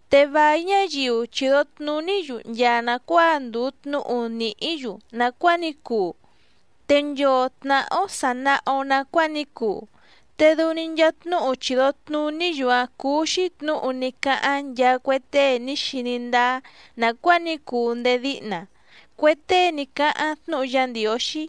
Te vài ñáyiu chìdo tnuní‑yu nchaa nàcuáa ndùu tnúhu nìhí‑yu nàcuáa ní cuu, te nchoo tnàhá‑ó sà naha‑o nacuáa ní cuu. Te dɨu‑ni nchaa tnúhu chìdo tnuní‑yu‑áⁿ cúú‑xí tnǔhu ní cáháⁿ nchaa cue tée ní xiní ndáá nàcuáa ní cuu ndéé díhna, cue tée ní cáháⁿ tnúhu Yá Ndiǒxí.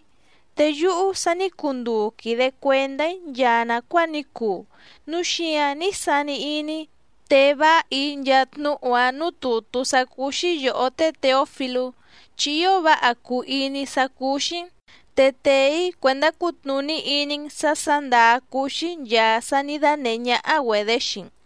Te yúhú sa ní cuu nduu quìde cuendá‑í nchaa nàcuáa ní cuu, núu xíǎⁿ ní sani iní‑í tee váha‑í nchaa tnúhu‑a núú tùtú sá cúú‑xí yòhó té Těofilú chi ío váha cùu iní‑í sá cúú‑xí‑n, te tèe‑í cuèndá cutnùní iní‑n sǎ sǎ ndàá cúú‑xí nchàa sá nǐ dánèhé ñáhá‑güedě xii‑n.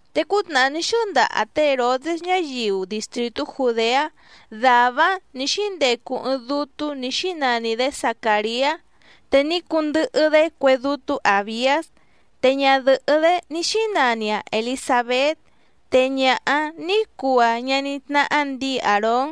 Te cútnàhá ní xɨ́ndaha té Hèrodés ñáyiu distrìtú Jùdeá dàvá‑áⁿ nǐ xíndecu ɨɨⁿ dútú nǐ xínani‑dě Zacàriá, te ní cundɨhɨ‑dé cue dútú Àbiás. Te ñadɨ̀hɨ́‑dé ní xínani‑aⁿ Èlisabét, te ñaha‑áⁿ nǐ cuu‑aⁿ ñaní tnáhá ndǐi Àrón.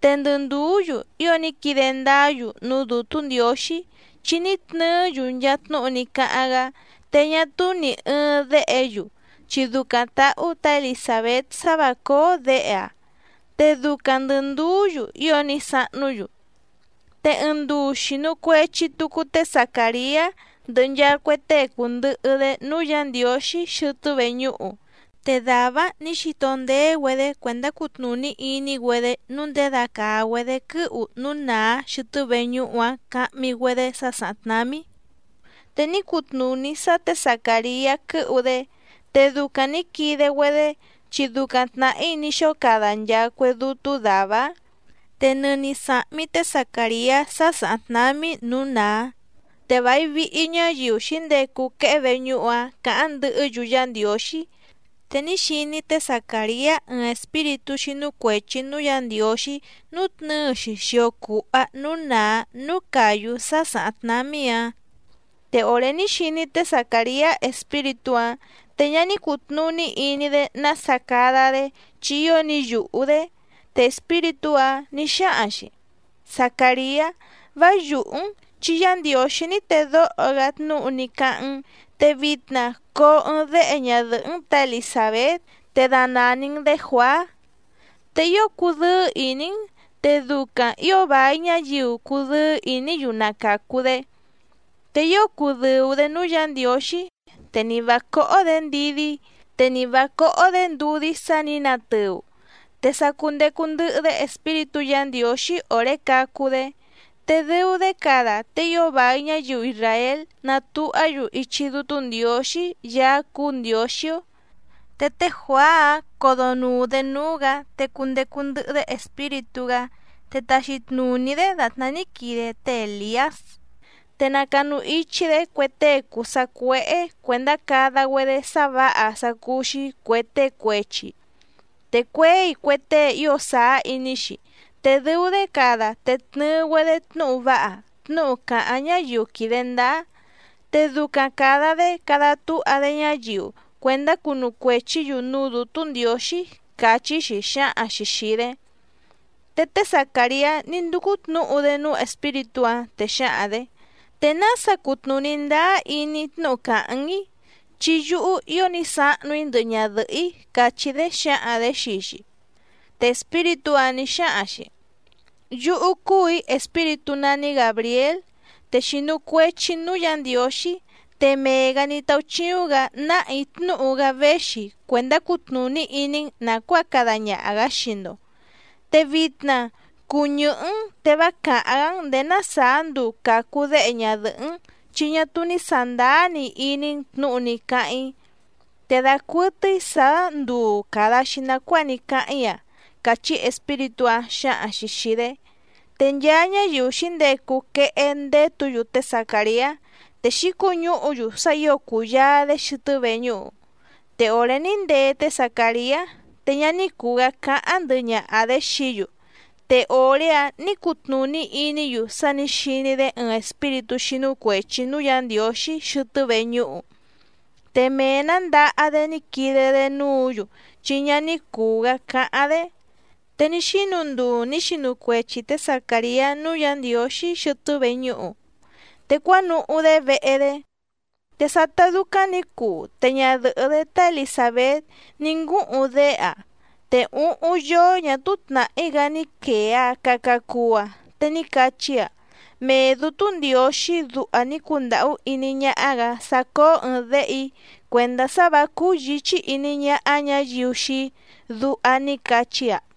Te ndɨ ndùú‑yu ío ní quide ndáá‑yu núú Dǔtú Ndiǒxí, chi ní tnɨɨ́‑yu nchaa tnúhu ní cáháⁿ‑gá. Te ñá túú nì ɨɨⁿ déhe‑yu, chi ducaⁿ tǎhú tǎ Elisàbét sá vǎ cóó děhe‑aⁿ, te ducaⁿ ndɨ̀ nduú‑yu ío ní sahnú‑yu. Te ɨɨⁿ nduu xìnu cuechi tucu té Zacàriá ndɨhɨ nchaa cue tée cùndɨhɨ‑dé núú Yǎ Ndiǒxí xɨtɨ́ veñúhu. Te dàvá‑áⁿ nǐ xito ndeé‑güedé cuèndá cutnùní iní‑güedé nǔu ndědacàa‑güedé quɨ́hu núú nàá xɨtɨ́ veñúhu‑áⁿ cahmi‑güedé sá sàháⁿ tnámí, te ní cutnùní sá tě Zacàriá quɨ́hu‑dé. Te ducaⁿ nǐ quide‑güedé, chi ducaⁿ tnàhí ní xóo cada nchaa cue dútú dàvá‑áⁿ. Te nɨni sàhmi té Zacàriá sá sàháⁿ tnámí nǔú nàá, te vài vihi ñáyiu xǐndecu quehé veñúhu‑áⁿ càháⁿ ndɨhɨ́‑yu Yá Ndiǒxí. Te ní xiní té Zacàriá ɨɨⁿ espíritú xínú cuèchi núú Yǎ Ndiǒxí nútnɨ̌ɨ‑xi xio cùha núú nàá núú càyú sá sàháⁿ tnámí‑áⁿ. Te òré ní xiní té Zacàriá espíritú‑áⁿ te ñá ní cùtnuní iní‑dé nása cada‑dé chi ío ní yùhú‑dé. Te espíritú‑áⁿ nǐ xáhaⁿ‑xi: —Zacàriá, vá yùhú‑n chi Yá Ndiǒxí ní tedóho‑gá tnúhu ní cáháⁿ‑n, te vitna coo ɨɨⁿ déhe ñadɨ̀hɨ́‑n tǎ Elisàbét te danàni‑n‑dé Juàá. Te ío cudɨ́ɨ́ ìní‑n, te ducaⁿ ǐo vài ñáyiu cudɨ́ɨ́ ìní‑yu na càcu‑dé. Te ío cudɨ̀u‑dé núú Yǎ Ndiǒxí, te ni vǎ cóhó‑dě ndidí te ni vǎ cóhó‑dě ndudí sá nǐ natɨu, te sa cundecu ndɨhɨ‑dé Espíritú Yǎ Ndiǒxí òré cacu‑dé. Te dɨu‑dé cada te ío vài ñáyiu isràél natuhá‑yu ichi Dútú Ndiǒxí Yaá cúú Ndiǒxí‑ó. Te té Juàá‑áⁿ codonùu‑dé núú‑gǎ, te cundecu ndɨhɨ‑dé Espíritú‑gá, te taxi tnùní‑dé dàtná ní quide té Èliás. Te nacanu ichi‑dé cue tée cùu sacuéhé cuèndá cada‑güedé sá vǎha sá cúú‑xí cuè tée cuechi, te cuěi cue tée ío sàá iní‑xi, te dɨu‑dé cada te tnɨɨ‑güedé tnúhu váha, tnúhu càháⁿ ñáyiu quìde ndáá. Te ducaⁿ càda‑dé cada túha‑dé ñáyiu cuèndá cunu cuèchí‑yu núú Dǔtú Ndiǒxí —càchí‑xi xǎhaⁿ‑xi xìi‑dé. Te té Zacàriá ní ndúcú tnǔhu‑dé núú espíritú‑áⁿ, te xǎhaⁿ‑dě: —¿Te nása cutnùní ndáá iní‑í tnúhu càháⁿ‑n‑í? Chi yúhú ío ní sahnu‑í ndɨhɨ ñadɨ̀hɨ́‑í —càchí‑dé xǎhaⁿ‑dě xii‑xi. Te espíritú‑áⁿ nǐ xáhaⁿ‑xi: —Yúhú cúù‑í espíritú nání Gàbriél, te xìnu cuechi‑í núú Yǎ Ndiǒxí, te mee‑gǎ ní táúchíúⁿ‑gǎ náhà‑í tnúhu‑gá véxi cuèndá cutnùní iní‑n nàcuáa cada ñaha‑gǎ xii‑ndo. Te vitna cuu ñɨ̀hɨ́‑n te vá càháⁿ‑gá‑n ndèé ná sàá nduu càcu déhe ñadɨ̀hɨ́‑n, chi ñá túú ní sàndáá‑ni iní‑n tnǔhu ní cáháⁿ‑í. Te dacuɨtɨ́í sǎá nduu càda‑xi nacuáa ní cáháⁿ‑í‑a —càchí espíritú‑áⁿ xǎhaⁿ‑xi xìi‑dé. Te nchaa ñáyiu xǐndecu quehé ndétǔ‑yu té Zacàriá, te xǐcuñúhu‑yu sá ǐo cùyaa‑dé xɨtɨ́ veñúhu. Te òré ní ndee té Zacàriá, te ñá ní cùu‑gá cáháⁿ ndɨhɨ ñaha‑dě xií‑yu, te òré‑áⁿ nǐ cutnùní iní‑yu sá nǐ xiní‑dé ɨɨⁿ espíritú xínú cuèchi núú Yǎ Ndiǒxí xɨtɨ́ veñúhu. Te mee‑nǎ ndaha‑dé ní quide‑dé núǔ‑yu chi ñá ní cùu‑gá cáháⁿ‑dé. Te ní xínu nduu nǐ xinu cuechi tě Zacàriá núú Yǎ Ndiǒxí xɨtɨ́ veñúhu, te cuánuhú‑dé vehe‑dé. Te sátá dúcáⁿ nǐ cuu te ñadɨ̀hɨ́‑dé tá Elisàbét ní ngúhuⁿ déhe‑aⁿ, te úhúⁿ yóó ñà túú tnàhí‑gá ní quèe‑aⁿ caca cuu‑aⁿ, te ní cachí‑aⁿ: “Mee Dǔtú Ndiǒxí duha ní cundàhú iní ñáhá‑gǎ sá cóó ɨ̀ɨⁿ déhe‑í cuèndá sá vǎ cúú yǐchí iní ñáhá ñǎyiu xii‑í”, duha ní cachí‑aⁿ.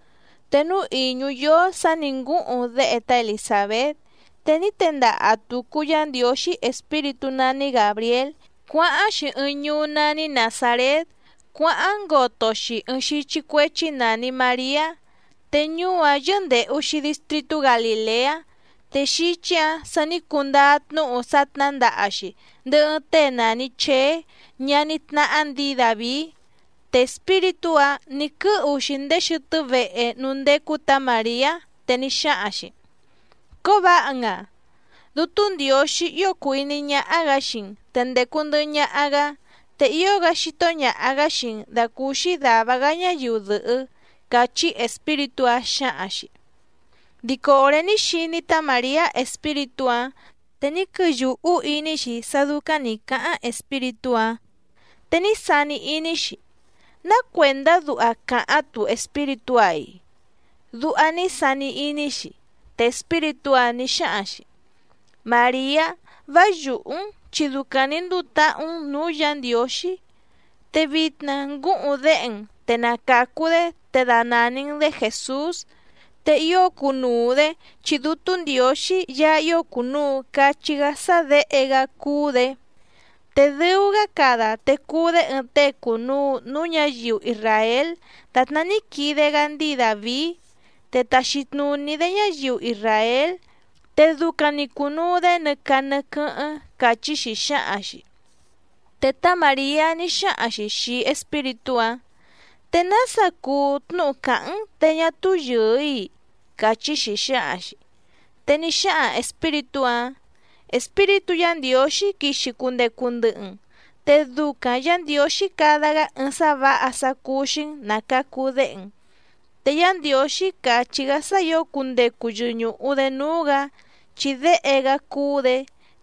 Te núú ìñú yóó sǎ nǐ ngúhuⁿ déhe tá Elisàbét, te ní tendaha tùcu Yá Ndiǒxí espíritú nání Gàbriél cuáháⁿ‑xi ɨɨⁿ ñuú nání Nàzarét cuáháⁿ ngoto‑xi ɨɨⁿ xíchí cuéchí nàni Mariá. Te ñuú‑áⁿ yɨ́ndèhu‑xi distritú Galìleá. Te xíchí‑ǎⁿ sa ní cundáá tnúhu sá tnǎndaha‑xi ndɨhɨ ɨɨⁿ tée nàni Cheé ñaní tnáhá ndǐi Dàvií. Te espíritú‑áⁿ nǐ quɨ́hu‑xi ndéé xɨtɨ́ vehe núú ndécú tǎ Màriá, te ní xáhaⁿ‑xi: —¡Cóvǎha‑n‑aⁿ! Dútú Ndiǒxí ío cùu iní ñáhá‑gǎ xii‑n te ndècu ndɨhɨ ñaha‑gá, te ío‑gá xító ñàha‑gá xii‑n dàcúúxí dàva‑gá ñáyiu dɨ̀hɨ́ —càchí espíritú‑áⁿ xǎhaⁿ‑xi. Dico òré ní xiní tá Màriá espíritú‑áⁿ, te ní quɨyùhú iní‑xi sá dúcáⁿ nǐ cáháⁿ espíritú‑áⁿ. Te ní sani iní‑xi: “¿Ná cuèndá duha càháⁿ‑tu espíritú‑a‑i?”, duha ní sani iní‑xi. Te espíritú‑áⁿ nǐ xáhaⁿ‑xi: —Màriá, vá yùhú‑n chi ducaⁿ nǐ nduu táhú‑n nǔu Yá Ndiǒxí. Te vitna ngúhuⁿ déhe‑n, te na càcu‑dé te danàni‑n‑dé Jèsús. Te ío cunuu‑dě, chi Dútú Ndiǒxí Yaá ío cùnuu cachí‑gá sá Děhe‑gá cúú‑dě, te dɨu‑gá cada te cuu‑dé ɨɨⁿ tée cùnuu núú ñǎyiu isràél dàtná ní quide‑gá ndíi Dàvií. Te taxi tnùní‑dé ñáyiu isràél, te ducaⁿ‑ni cùnuu‑dé nɨ caa nɨ quɨ́hɨ́ⁿ —càchí‑xi xǎhaⁿ‑xi. Te tá Màriá ní xáhaⁿ‑xi xìi espíritú‑áⁿ: —¿Te nása cuu tnúhu càháⁿ‑n te ñá túú yɨ̀ɨ‑í‑i? —càchí‑xi xǎhaⁿ‑xi. Te ní xáhaⁿ espíritú‑áⁿ: —Espíritú Yǎ Ndiǒxí quixi cundecu ndɨhɨ‑n, te ducaⁿ Yǎ Ndiǒxí cada‑gá ɨɨⁿ sá vǎha sá cúú‑xí‑n ná càcu déhe‑n. Te Yá Ndiǒxí càchí‑gá sá ǐo cundecu yɨñùhu‑dé núú‑gǎ, chi Déhe‑gá cúú‑dě.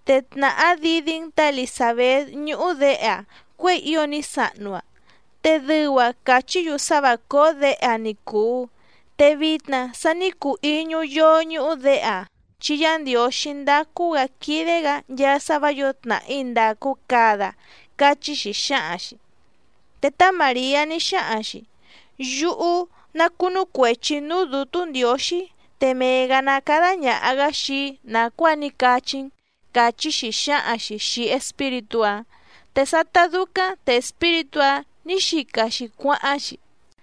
Te tnàhá didí‑n tǎ Elisàbét ñúhú děhe‑aⁿ cuěi ío ní sahnu‑aⁿ, te dɨu‑aⁿ càchí‑yu sá vǎ cóó děhe‑aⁿ ni cùu, te vitna sa ní cuu íñú yóó ñúhú děhe‑aⁿ. Chi Yá Ndiǒxí ndácú‑gǎ quídé‑gǎ nchaa sá vǎ yǒo tnàhí ndàcu cada —cachí‑xi xǎhaⁿ‑xi. Te tá Màriá ní xáhaⁿ‑xi: —Yúhú ná cúnú cuèchi‑í núú Dǔtú Ndiǒxí, te mee‑gǎ ná cádá ñàha‑gá xii‑í nàcuáa ní cachí‑n —càchí‑xi xǎhaⁿ‑xi xìi espíritú‑áⁿ. Te sátá dúcáⁿ te espíritú‑áⁿ nǐ xica‑xi cuáháⁿ‑xi.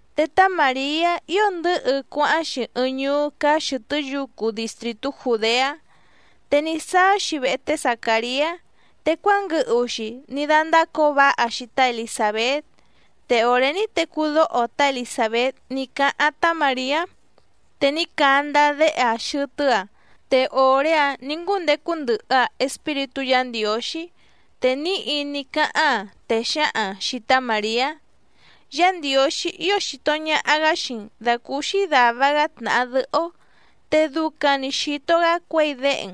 Te tá Màriá ío ndɨ̌hɨ cuáháⁿ‑xi ɨɨⁿ ñuú cáá xɨ̀tɨ́ yucu distrìtú Jùdeá. Te ní sáá‑xi vehe té Zacàriá, te cuánguɨhu‑xi ní dándácǒo váha‑xi tá Elisàbét. Te òré ní tecú dóho tá Elisàbét ní cáháⁿ tá Màriá, te ní candá déhe‑aⁿ xɨtɨ́‑aⁿ, te òré‑áⁿ nǐ ngúndecu ndɨhɨ‑aⁿ Espíritú Yǎ Ndiǒxí. Te níhi ní cáháⁿ‑aⁿ, te xǎhaⁿ‑aⁿ xìi tá Màriá: —Yá Ndiǒxí ío xìto ñaha‑gá xii‑n dàcúúxí dàva‑gá tnàha dɨhɨ́‑ó, te ducaⁿ‑ni xìto‑gá cuěi déhe‑n.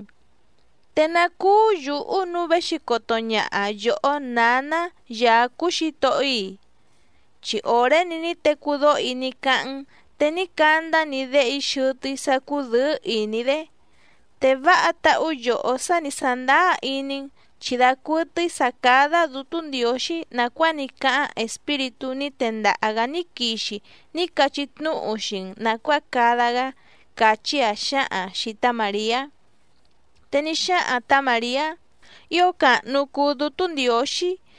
¿Te ná cúú yǔhú nǔu véxi coto ñaha yòhó nǎná Yaá cúú Xǐtohó‑í‑i? Chi òré‑ni ní tecú dóho‑í ní cáháⁿ‑n te ní candá‑ni déhe‑í xɨtɨ́‑í sá cùdɨ́ɨ́ ìní‑dé. Te váha táhú yòhó sá ni sàndáá iní‑n, chi dacuɨtɨ́í sǎ cádá Dǔtú Ndiǒxí nàcuáa ní cáháⁿ espíritú ní tendaha‑gǎ ní quixi ní cachí tnúhu xii‑n nàcuáa cada‑gá —càchí‑aⁿ xǎhaⁿ‑aⁿ xìi tá Màriá. Te ní xáhaⁿ tǎ Màriá: Ío càhnu cuu Dútú Ndiǒxí,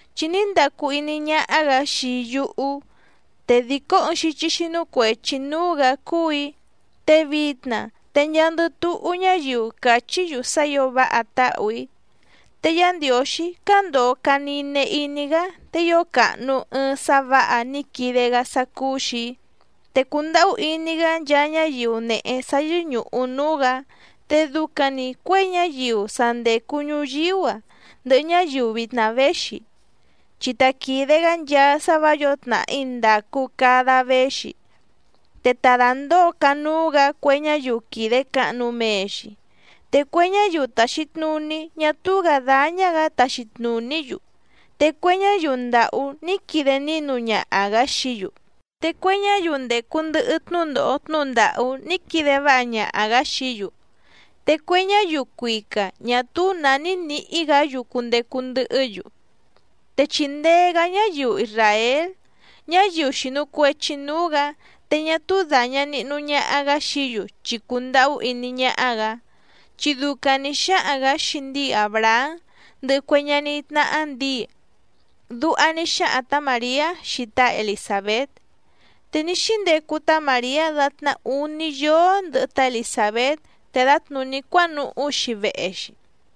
Chi ní ndacu iní ñáhá‑gǎ xii yúhú, te dìcó ɨɨⁿ xíchí xínú cuèchi núú‑gǎ cúù‑í, te vitna te nchaandɨ túhú ñáyiu cachí‑yu sá ǐo váha táhù‑í. Te Yá Ndiǒxí cándòo caa nine iní‑gá, te ío càhnu ɨɨⁿ sá vǎha ní quide‑gá sá cúú‑xì‑í. Te cùndahú iní‑gá nchaa ñáyiu nèhe sá yɨ́ñùhu núú‑gǎ. Te ducaⁿ‑ni cuěi ñáyiu sa ndècu ñuyíú‑a ndɨhɨ ñáyiu vitna véxi. Chi ta quìde‑gá nchaa sá vǎ yǒo tnàhí ndàcu cada véxi, te ta dàndóo canúú‑gǎ cue ñáyiu quìde cahnu mee‑xi. Te cue ñáyiu tàxi tnuní ñá túú‑gǎ dáñá‑gǎ taxi tnùní‑yu, te cue ñáyiu ndàhú ní quide nínu ñaha‑gǎ xií‑yu. Te cue ñáyiu ndècu ndɨhɨ tnúndòho tnúhu ndàhú ní quide váha ñaha‑gǎ xií‑yu, te cue ñáyiu cuica ñà túú nǎ ní nǐhí‑gǎ‑yu cundecu ndɨhɨ́‑yu. Te chìndee‑gá ñáyiu isràél, ñáyiu xìnu cuechi núú‑gǎ, te ñá túú dàña nihnu ñaha‑gá xií‑yu, chi cùndahú iní ñáhá‑gǎ. Chi ducaⁿ nǐ xáhaⁿ‑gǎ xii ndíi Àbrahám, ndɨhɨ cue ñaní tnáhá ndǐi. Duha ní xáhaⁿ tǎ Màriá xii tá Elisàbét. Te ní xíndecu tá Màriá dàtná úní yóó ndɨhɨ tá Elisàbét te dǎtnùní cuánuhú‑xi vehe‑xi.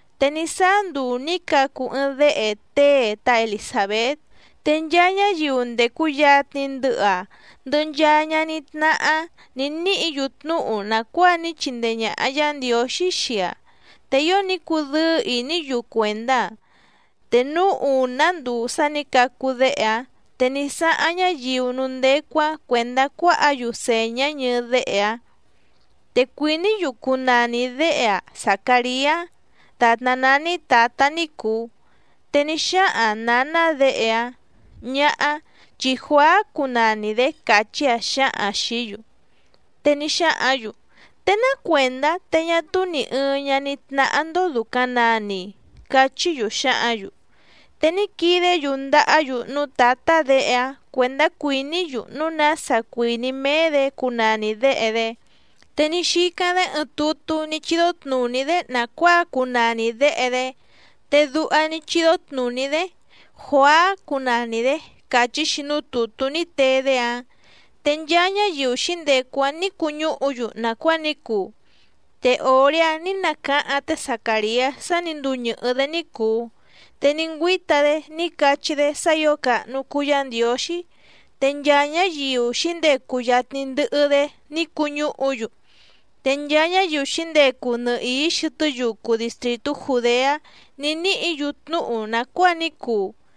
Te ní sáá nduu nǐ cacu ɨɨⁿ déhe tée tá Elisàbét. Te nchaa ñáyiu ndècu yatni ndɨhɨ‑aⁿ, ndɨhɨ nchaa ñaní tnáhá‑áⁿ nǐ níhǐ‑yu tnúhu nàcuáa ní chindee ñàha Yá Ndiǒxí xii‑aⁿ. Te ío ní cudɨ́ɨ́ ìní‑yu cuèndá‑aⁿ. Te núú ùná nduu sá nǐ cacu déhe‑aⁿ, te ní sáháⁿ ñáyiu núú ndécú‑áⁿ cuèndá cuáhǎ‑yu sèñá ñɨɨ déhe‑aⁿ. Te cuìní‑yu cunani děhe‑áⁿ Zacàriá dàtná nání tǎtá ní cùu. Te ní xáhaⁿ nǎná děhe‑áⁿ: —Ñáhá, chi Juàá cunani‑dě —càchí‑aⁿ xǎhaⁿ‑aⁿ xìí‑yu. Te ní xáhǎⁿ‑yu: —¿Te ná cuèndá te ñá túú nì ɨɨⁿ ñaní tnáhá‑ndó dùcaⁿ nani‑i? —cachí‑yu xǎhǎⁿ‑yu. Te ní quidé‑yu ndàhá‑yu núú tǎtá děhe‑áⁿ cuèndá cuìní‑yu núu nása cuìní méé‑dě cunani děhe‑dé. Te ní xícáⁿ‑dé ɨɨⁿ tutú ní chídó tnùní‑dé nàcuáa cunani děhe‑dé, te duha ní chídó tnùní‑dé: “Juàá cunani‑dě”, càchí‑xi núú tùtú ní tee‑dé‑áⁿ. Te nchaa ñáyiu xǐndecu‑áⁿ nǐ cuñúhu‑yu nàcuáa ní cuu. Te òré‑áⁿ nǐ nacáháⁿ té Zacàriá sá nǐ cuu ñɨ̀hɨ́‑dé ní cùu, te ní ngüíta‑dé ní cachí‑dé sá ǐo càhnu cuu Yá Ndiǒxí. Te nchaa ñáyiu xǐndecu yatni ndɨhɨ‑dé ní cuñúhu‑yu, te nchaa ñáyiu xǐndecu nɨhìí xɨtɨ́ yucu distrìtú Jùdeá ní níhǐ‑yu tnúhu nàcuáa ní cuu.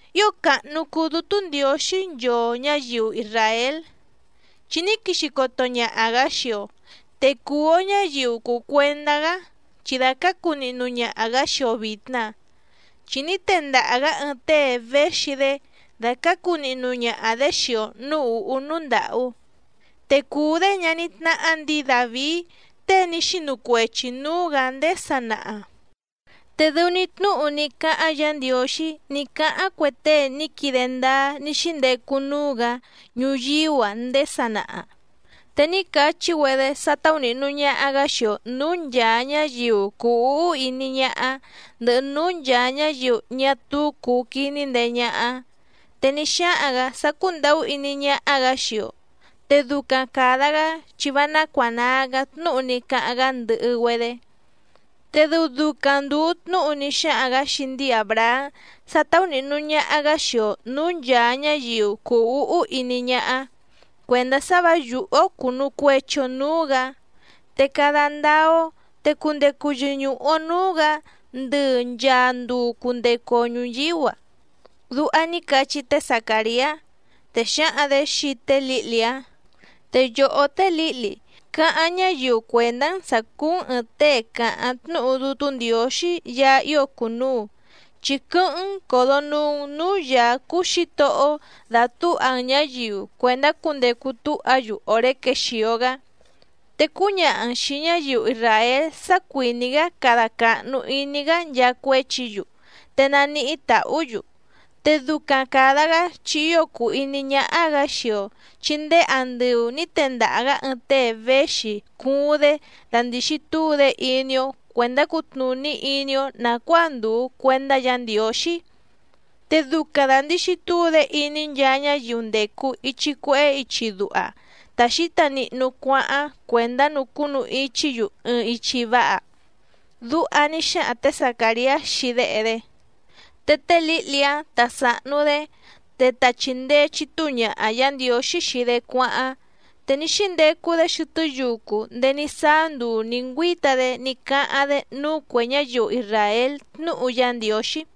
Ío càhnu cuu Dútú Ndiǒxí nchoo ñǎyiu isràél, chi ní quixi coto ñaha‑gǎ xii‑o, te cùu‑o ñáyiu cùu cuendá‑gá, chi dàcácu nihnu ñaha‑gǎ xii‑o vìtna. Chi ní tendaha‑gǎ ɨɨⁿ tée véxi‑dé dàcácu nihnu ñaha‑dě xii‑o nǔú ùhú núú ndàhú. Te cùu‑dé ñaní tnáhá ndǐi Dàvií tée ní xinu cuechi nǔú‑gǎ ndéé sanaha. Te dɨu‑ni tnúhu ní cáháⁿ Yǎ Ndiǒxí ní cáháⁿ cue tée ní quide ndáá ní xíndecu núú‑gǎ ñuyíú‑a ndéé sanaha. Te ní cachí‑güedé sá táúnìhnu ñaha‑gá xii‑o nǔú nchàa ñáyiu cùu úhú iní ñáhá, ndɨhɨ núú nchàa ñáyiu ñá túú cùu quiní ndee ñáhá. Te ní xáhaⁿ‑gǎ sá cúndàhú iní ñáhá‑gǎ xii‑o, te ducaⁿ càda‑gá chi vá nácuànaa‑gá tnúhu ní cáháⁿ‑gá ndɨhɨ‑güedé. Te dɨu ducaⁿ ndùu tnúhu ní xáhaⁿ‑gǎ xii ndíi Àbrahám sá táúnìhnu ñaha‑gá xii‑o nǔú nchàa ñáyiu cùu úhú iní ñáhá, cuèndá sá vǎ yùhú‑ó cùnu cuechi‑o núú‑gǎ. Te cada ndáá‑ó, te cundecu yɨñùhu‑o núú‑gǎ ndɨ nchàa nduu cundecu‑o ñuyíú‑a. Duha ní cachí té Zacàriá. Te xǎhaⁿ‑dě xii té lǐhli‑áⁿ: Te yòhó té lǐhli, cáháⁿ ñáyiu cuèndá‑n sǎ cúú‑n ɨ̀ɨⁿ tée càháⁿ tnúhu Dútú Ndiǒxí Yaá ío cùnuu, chi quɨ́hɨ́ⁿ‑n còdonuu‑n núú Yǎá cúú Xǐtohó‑ó dàtúha‑n ñǎyiu cuèndá cundecu túha‑yu òré quexìo‑gá. Te cúñaha‑n xìi ñáyiu isràél sá cuìní‑gá cada càhnu iní‑gá nchaa cuéchi‑yu, te naníhí tàhú‑yu. Te ducaⁿ càda‑gá chi ío cùu iní ñáhá‑gǎ xii‑o, chi ndéé andɨu nǐ tendaha‑gǎ ɨɨⁿ tée véxi cuuⁿ‑dé dandìxi túu‑dé iní‑ó cuèndá cutnùní iní‑ó nàcuáa ndùu cuendá Yǎ Ndiǒxí. Te ducaⁿ dàndixi túu‑dé iní nchaa ñáyiu ndècu ichi cuehé ichi duha ta xǐta nihnu cuáháⁿ cuèndá nucúnu ichí‑yu ɨɨⁿ ichi váha. Duha ní xáhaⁿ tě Zacàriá xii déhe‑dé. Te té lǐhli‑áⁿ tá sàhnu‑dé, te ta chìndee chitúu ñaha Yǎ Ndiǒxí xii‑dé cuáháⁿ, te ní xíndecu‑dé xɨtɨ́ yucu ndéé ní sáá nduu nǐ ngüíta‑dé ní cáháⁿ‑dé núú cuè ñáyiu isràél tnúhu Yá Ndiǒxí.